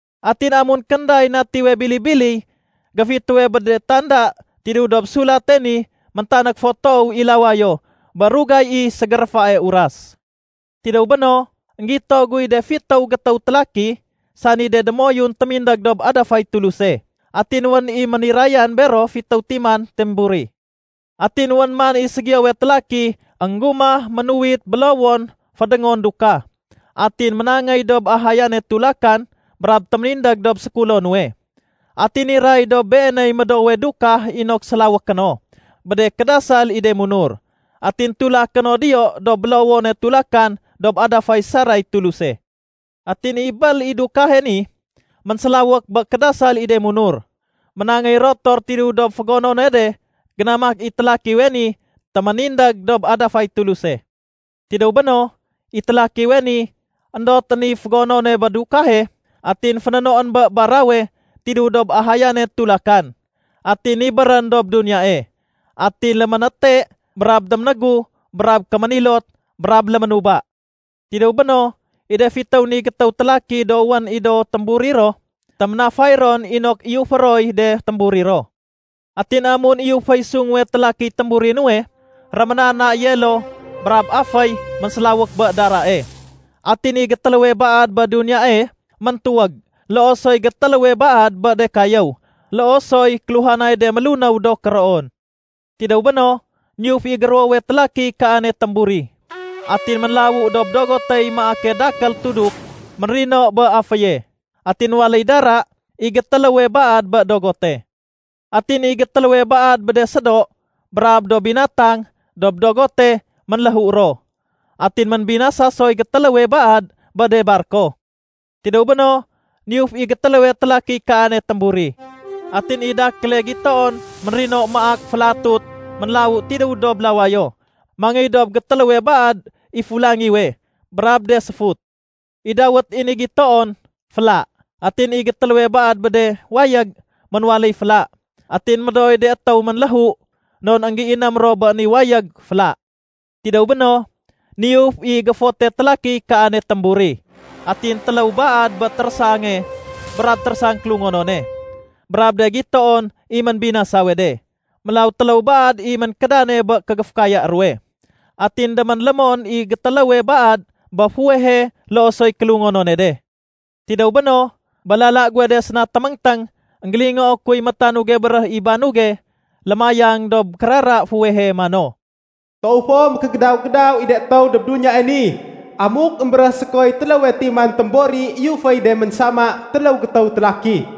Atin amun kénday Natiwe Bili-biliy géfitéwe bé de tanda tidéw dob sulate ni méntanék fo toow i lawayo bé rugay i ségéréfae uras. Tidéw béno, énggito guy de fitéw gétéw télaki, sani de démoyun témindég dob adafay Tuluse. Atin wén i ménirayan bero fitéw timan témburi. Atin wén man i ségiyowe télaki énggumah ménuwit bélowon fédéngon dukah. Atin ménangéy dob ahayane tulakan brab téménindég dob sékulo nuwe. Atin niray dob beeney médoowe dukah inok sélawéké no bé de kédasal i de munur. Atin tulaké no diyo dob bélowone tulakan dob adafay saray Tuluse. Atin i bél i dukahe ni ménsélawék bé kédasal i de munur, ménangéy rotor tidéw dob fégonone de génamak i télakiwe ni téménindég dob adafay Tuluse. Tidéw béno, i télakiwe ni, éndotén i fégonone bé dukahe atin fénénoén bé barawe tidéw dob ahayane tulakan, atin nibérén dob duniyae. Atin léménéte brab déménégu brab kéménilot brab léménuba. Tidéw béno, i de fitéw ni gétéw télaki do wén i do témburi ro, téménafay ron inok iyufé roy de témburi ro. Atin amun iyuféy sunguwe télakiy témburi nuwe, réménana yelo brab aféy ménsélawék bé darae. Atin i gétéléwe baad bé duniyae méntuwég, loo soy gétéléwe baad bé de kayéw, loo soy kéluhanay de mélunéw do kéroon. Tidéw béno, niyuf i géruwowe télakiy kaane témburi. Atin ménlawu dob dogotey maake dakél tuduk ménrino bé aféye. Atin waléy dara i gétéléwe baad bé dogote. Atin i gétéléwe baad bé de sédo brab do binatang dob dogote ménléhu ro. Atin ménbinasa soy gétéléwe baad bé de barko. Tidéw béno, niyuf i gétéléwe télakiy kaane témburi. Atin i dakéle gitoon ménrino maak félatut ménlawu tidéw dob lawayo mangéy dob gétéléwe baad i fulangiwe brab de séfut. I dawét i ni gitoon, “Féla”. Atin i gétéléwe baad bé de wayég ménwaléy féla. Atin médooy de étéw ménléhu non énggéiném ro bé ni wayég féla. Tidéw béno, niyuf i géfote télakiy kaane témburi. Atin téléw baad bé térésange brab térésang kélungonone brab de gitoon i ménbinasawe de. Mélaw téléw baad i ménkédane bé kégéfékaya ruwe. Atin déménlémon i gétéléwe baad bé fuwehe loo soy kélungone de. Tidéw béno, bé lala guwe de séna téméngténg, énggélingoo kuy métanuge béréh i banuge lémayang dob kérara fuwehe mano, “Toow fo mékégédaw-gédaw i de étéw dob duniyae ni amuk émbéréh sékoy téléwe timan témburi iyuféy de ménsama téléw gétéw télaki!”